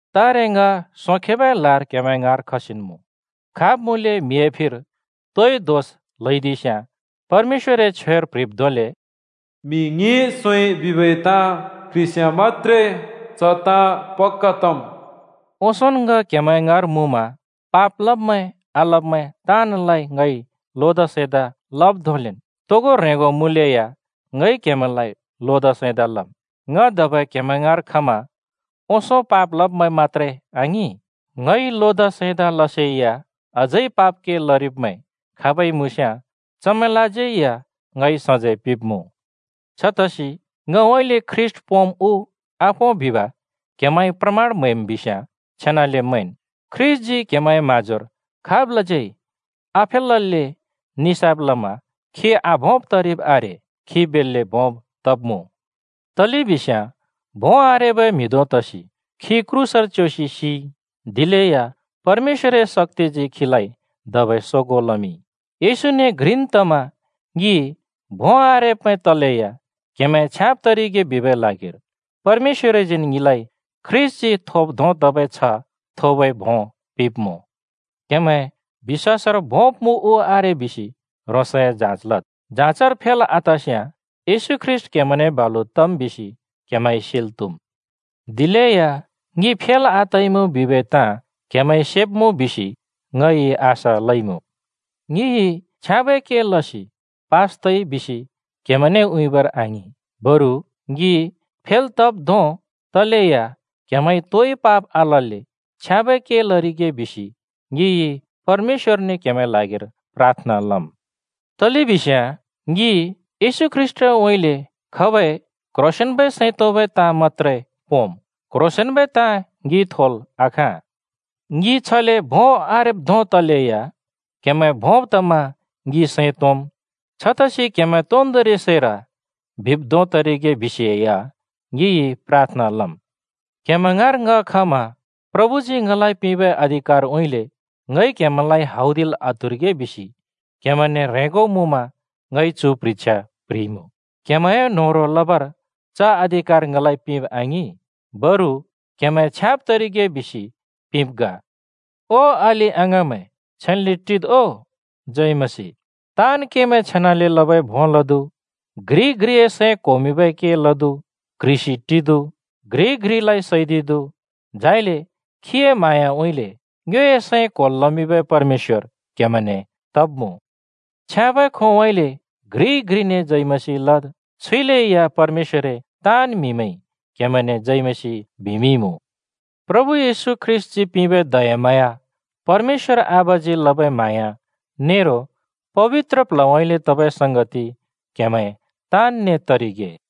तारे ङ सोंखेबै लार क्‍हेमैं ङाँर खसिन् मुँ। खाब् मुँलै म्हिए फिर तोइ दोष ल्हैदिस्याँ परमेश्‍वरए छ्वेर प्‍ह्रिब् धोंले, “म्‍हि ङ्हिं सोंइ बिबै ताँ क्ह्रिस्याँ मत्‍त्रे च ताँ पक्‍का तम्।” ओंसोंन् ङ क्‍हेमैं ङाँर मुँमा पाप लब्मैं आलब्मैं ताँनलाइ ङइ लोदा सैंदा लब् धोंलेन्, तोगो ह्रेंगो मुँलेया ङइ क्‍हेमैंलाइ लोदा सैंदा लम्: ङ धबै क्‍हेमैं ङाँर खमा ओंसों पाप लब्मैं मत्‍त्रे आङिं, ङइ लोदा सैंदा लसेया अझै पाप के लरिब्मैं खाबै मुँस्याँ चमैंलाज्यै या ङइ सजैं पिंब्मुँ। छतसि ङउँइँले ख्रीष्‍ट पोंम् उ आपों बिब क्‍हेमैंइ प्रमाण म्हैम् बिस्याँ छेनाले मैंन्, ख्रीष्‍टजी क्‍हेमैंए म्हाँजोर खाबलाज्यै आफेलल्‍ले निसाफ लमा खी आभोंब् तरिब् आरे, खी बेल्‍ले भोंब् तब्मुँ। तलेबिस्याँ भों आरेबै म्हि धों तसि खी क्रूसर च्‍योसि सिइ, दिलेया परमेश्‍वरए शक्‍तिजी खीलाइ धबै सोगों लमिंइ। येशूने घ्रिन् तमा ङि भों आरेब्मैं तलेया क्‍हेमैं छ्याँब् तरिगे बिबै ल्हागिर परमेश्‍वरजीन् ङिलाइ ख्रीष्‍टजी थोब् धों तबै छ्ह थोबै भों पिंब्मुँ। क्‍हेमैं बिश्‍वासर भोंब मुँ उ आरे बिसि ह्रोंसए जाँच लद्। जाँचर फेल् आतस्याँ येशू ख्रीष्‍ट क्‍हेमैंने बालु तम् बिसि क्हेमैंइ सेल् त्हुम्। दिलेया ङि फेल् आतइमुँ बिबै ताँ क्‍हेमैंइ सेब्‍मुँ बिसि ङइ आशा लइमुँ। ङिइ छ्याँबै के लसि पास तइ बिसि क्‍हेमैंने उँइँबर आङिं, बरु ङि फेल् तब् धों तलेया क्‍हेमैंइ तोइ पाप आलल्‍ले छ्याँबै के लरिगे बिसि ङिइ परमेश्‍वरने क्हेमैंए ल्हागिर प्राथना लम्। तलेबिस्याँ ङि येशू ख्रीष्‍टउँइँले खबै क्ह्रोंसेंन्बै सैं तोंबै ताँ मत्‍त्रे पोंम्, क्ह्रोंसेंन्बै ताँ ङिइ थोल् आखाँ। ङि छले भों आरेब् धों तलेया क्‍हेमैं भोंब् तमा ङि सैं तोंम्। छतसि क्‍हेमैं तोन्दोंरि सैर बिब् धों तरिगे बिसे या ङिइ प्राथना लम्। क्‍हेमैं ङाँर ङ खमा प्रभुजी ङलाइ पिंबै अधिकारउँइँले ङइ क्‍हेमैलाइं हौदिल् आत्‍हुरिगे बिसि क्‍हेमैंने ह्रेंगो मुँमा ङइ चु प्ह्रिछ्या प्ह्रिइमुँ। क्‍हेमैंए न्होह्रों लबर च अधिकार ङलाइ पिंब आङिं, बरु क्‍हेमैं छ्याँब् तरिगे बिसि पिंब् ग। ओ अलि-अङाँमैं, छेन्‍ले टिद् ओ, जय मसीह। ताँन् केमैं छेनाले लबै भों लदु, घ्रिइ-घ्रिए सैं क्होमिंबै के लदु, क्ह्रिसि टिदु, घ्रिइ-घ्रिलाइ सैदिदु। झाइले खीए म्हाँयाउँइँले ङ्योए सैं क्‍होल् लमिंबै परमेश्‍वर क्‍हेमैंने तब्‍मुँ। छ्याँबै खोंउँइँले घ्रिइ घ्रिने जय मसीह लद्। छुइले या परमेश्‍वरए ताँन् म्‍हिमैंइ क्‍हेमैंने जय मसीह बिमिंइमुँ। प्रभु येशू ख्रीष्‍टजी पिंबै दयाम्हाँया, परमेश्‍वर आबाजी लबै म्हाँया नेरो पबित्र प्ल्हउँइँले तबै संगति क्‍हेमैं ताँनने तरिगे।